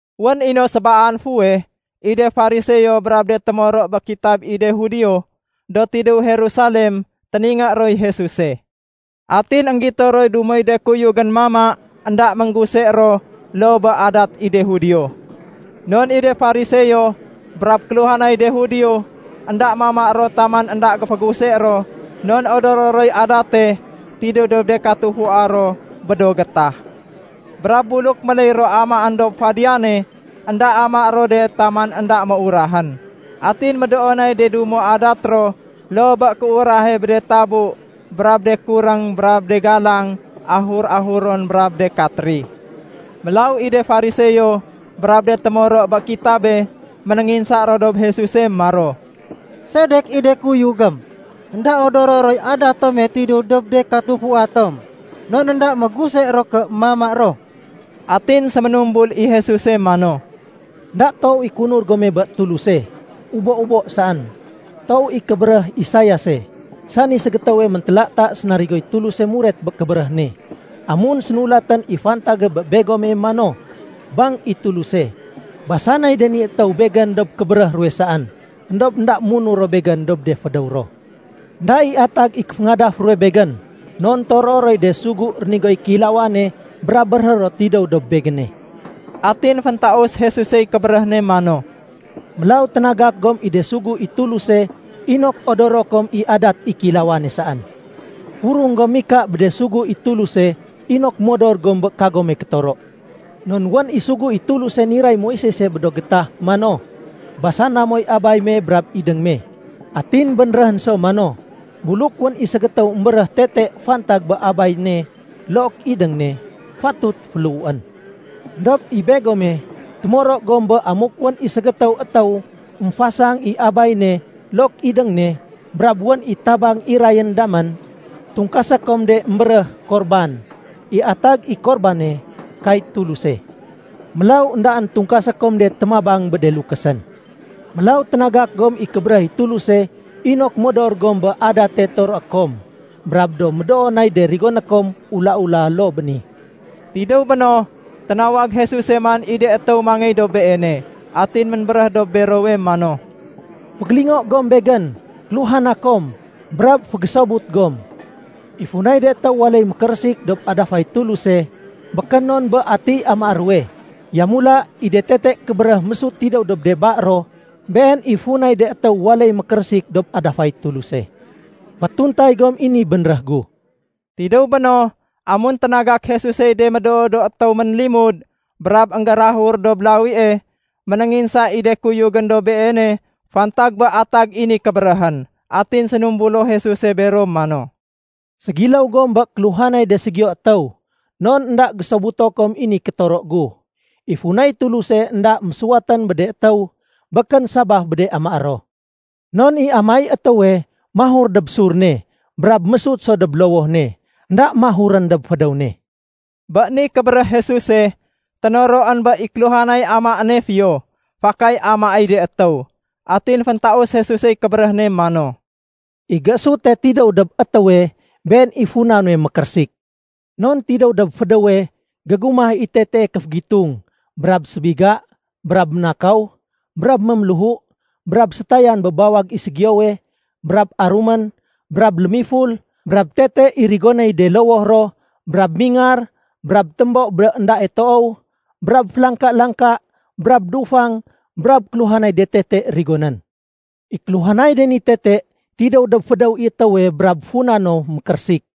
Wén i no sébaan fuweh, i de Fariseo brab de témoro bé kitab i de Judio, do tidéw Jerusalem, téningé roy Jesuse. Atin énggito roy dumoy de kuyugén mama énda méngguse ro loo bé adat i de Judio. Non i de Fariseo, brab kéluhanay de Judio, énda mama ro taman énda géféguse ro non odoro roy adate tidéw dob de katufua ro bé do gétah. Brab buluk méléy ro amaén dob fadiyane, énda amaé ro de taman énda méurahén. Atin médoo nay de dumo adat ro loo bé kéurahe bé de tabu brab de kuréng brab de galang ahur-ahuron brab de katri. Mélaw i de Fariseo brab de témoro bé kitabe, ménénginsa ro dob Jesuse maro, “Sedek i de kuyugém énda odoro roy adat tome tidéw dob de katufua tom, non énda méguse ro ké mama ro?” Atin séménumbul i Jesuse mano, “Enda toow i kéunur gome bé Tuluse, ubo-ubo saén. Toow i kébéréh Isaiase, sani ségétéwe méntélata sénarigoy Tuluse muret bé kébéréh ne, amun sénulatén i fantage bé begome mano, ‘Bang i Tuluse, basanay de ni étéw Begén dob kébéréh ruwe saén. Endob énda munur ro Begén dob de fédéw ro. Enda i atag i kéféngadaf ruwe Begén, non toroé roy de sugu rénigoy kéilawane brab béréhé ro tidéw dob Begéne.’” Atin féntaus Jesusey kébéréh ne mano, “Mélaw ténagak gom i de sugu i Tuluse inok odoro kom i adat i kéilawane saén. Furung gom mika bé de sugu i Tuluse inok modor gom bé kagome kétoro. Non wén i sugu i Tuluse niray Moisese bé do gétah mano, ‘Basana moy abay me brab idéng me.’ Atin bénréhén so mano, ‘Buluk wén i ségétéw émbéréh tete fantag bé abay ne look idéng ne, fatut féléhuén.’ Endob i begome, témoro gom bé amuk wén i ségétéw étéw émfasang i abay ne look idéng ne, brab wén i tabang irayén damén, tungkasé kom de émbéréh ‘Korban’. (I atag i Korbane ‘Kay Tuluse’.) Mélaw éndaén tungkasé kom de témabang bé de lukésén. Mélaw ténagak gom i kébéréh i Tuluse inok modor gom bé adate toroé kom. Brab do médoo nay de rigoné kom ula-ula loo bé ni.” Tidéw béno, ténawag Jesuse man i de étéw mangéy dob Beene. Atin ménbéréh dob berowe mano, “Fégélingo gom Begén, kéluhana kom, brab fégésobut gom. I funay de étéw waléy mékérésik dob adafay Tuluse, békén non bé atiy amaé ruwe. Yamula, i de tete kébéréh mésut tidéw dob de ba ro, been i funay de étéw waléy mékérésik dob adafay Tuluse. Fétuntay gom i ni bénréh gu.” Tidéw béno, amun ténagak Jesusey de médoo do étéw ménlimud brab énggérahur dob lawie, ménénginsa i de kuyugén dob Beene fantag bé atag i ni kébéréhén. Atin sénumbulo Jesuse bero mano, “Ségiléw gom bé kéluhanay de ségiyo étéw, non énda gésobuto kom i ni kétoro gu. I funay Tuluse énda mésuwatén bé de étéw békén sabaf bé de amaé ro. Non i amaéy étéwe, mahur dob sur ne brab mésut so dob lowoh ne. Enda mahurén dob fédéw ne.” Bé ni kébéréh Jesuse, ténoroén bé i kéluhanay amaéne fiyo, fakay amaéy de étéw. Atin féntaus Jesusey kébéréh ne mano, “I géésute tidéw dob étéwe, been i funa nuwe mékérésik. Non tidéw dob fédéwe, gégumah i tetee kéfégitung, brab sébiga, brab ménakaw, brab méméléhu, brab sétayan bé bawag i ségiyowe, brab arumén, brab lémiful, brab tete i rigonéy de lowoh ro, brab mingar, brab témbo bé éndae toow, brab félangka-langka, brab dufang, brab kéluhanay de tete rigonén. I kéluhanay de ni tete tidéw dob fédéw i étéwe brab funa no mékérésik.”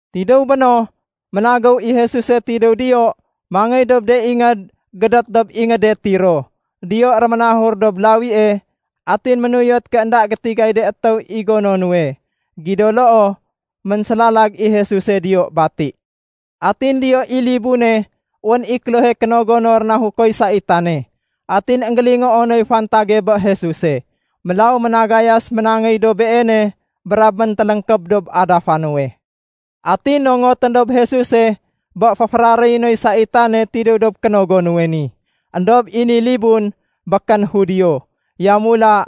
Tidéw béno, ménagéw i Jesuse tidéw diyo mangéy dob de ingéd gédét dob ingéde Tiro. Diyo réménahur dob lawie, atin ménuyot ké énda gétigay de étéw i gono nuwe. Gido loo, ménsélalag i Jesuse diyo bati. Atin diyo i libune wén i klohe kénogo no rénahukoy saitane. Atin énggélingoo noy fantage bé Jesuse. Mélaw ménagayas ménangéy dob Beene brab méntéléngkéb dob adafa nuwe. Atin nongotén dob Jesuse bé féféraréyé noy saitane tidéw dob kénogo nuwe ni. Endob i ni libun, békén Judio. Yamula,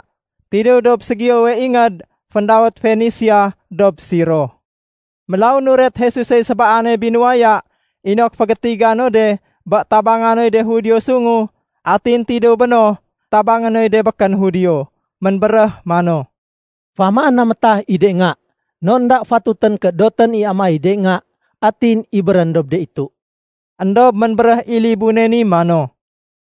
tidéw dob ségiyowe ingéd féndawét Fenisia dob Siro. Mélaw nuret Jesusey sébaane binuwaya inok fégétiga no de bé tabangé noy de Judio sungu, atin tidéw béno tabangé noy de békén Judio. Ménbéréh mano, “Féamaén na métah i de nga. Non énda fatutén ké dotén i amaéy de nga atin ibérén dob de itu.” Endob ménbéréh i libune ni mano,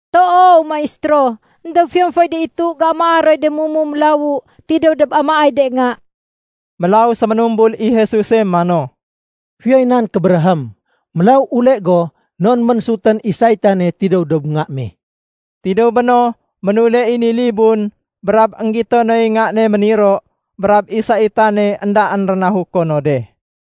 “Toow, Maistéro, éndob fiyon foy de itu géamaa roy de mumu mélawu tidéw dob amaéy de nga.” Mélaw séménumbul i Jesuse mano, “Fiyoy nan kébéréhém. Mélaw ule go non ménsutén i saitane tidéw dob nga me.” Tidéw béno, ménule i ni libun, brab énggito noy nga ne méniro, brab i saitane éndaén rénahuko no de.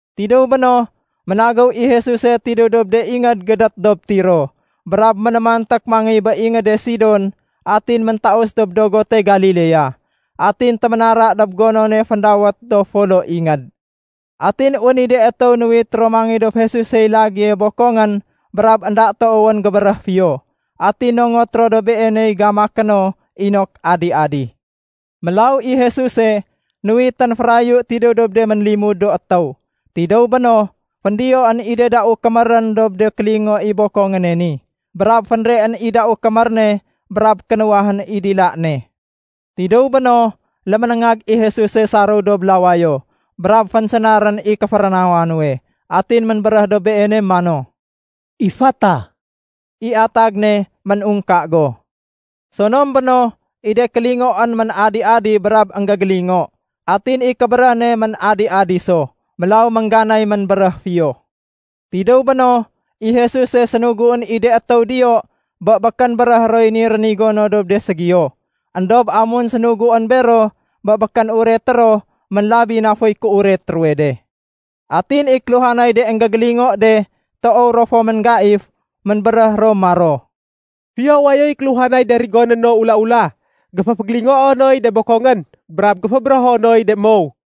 Tidéw béno, ménagéw i Jesuse tidéw dob de ingéd gédét dob Tiro brab ménémanték mangéy bé ingéde Sidon atin méntaus dob dogote Galilea. Atin téménara dob gonone féndawét “Do Folo Ingéd”. Atin wén i de étéw nuwit ro mangéy dob Jesusey lagéye bokongén brab énda toowén gébéréh fiyo. Atin nongot ro dob Beeney gamaké no inok adi-adi. Mélaw i Jesuse, nuwitén férayu tidéw dob de ménlimud do étéw. Tidéw béno, féndiyoén i de dau kémérén dob de kélingo i bokongéne ni, brab fénreén i dau kémér ne brab kénuwahén i dila ne. Tidéw béno, léménéngag i Jesuse saréw dob lawayo, brab fénsénarén i kéférénawa nuwe, atin ménbéréh dob beene mano, “Ifata”. (I atag ne “Méungka go.”) Sonom béno, i de kélingoén ménadi-adi brab énggégélingo, atin i kébéréh ne ménadi-adi so. Mélaw méngganay ménbéréh fiyo. Tidéw béno, i Jesuse sénuguén i de étéw diyo bé békén béréhé roy ni rénigo no dob de ségiyo. Endob amun sénuguén bero bé békén ureté ro, ménlabi na foy kéuret ruwe de. Atin i kéluhanay de énggégélingo de toow ro fo ménggaif. Ménbéréh ro maro, “Fiyo wayoy kéluhanay de rigoné no ula-ula. Géféfégélingoo noy de bokongén brab géfébérého noy de mow.”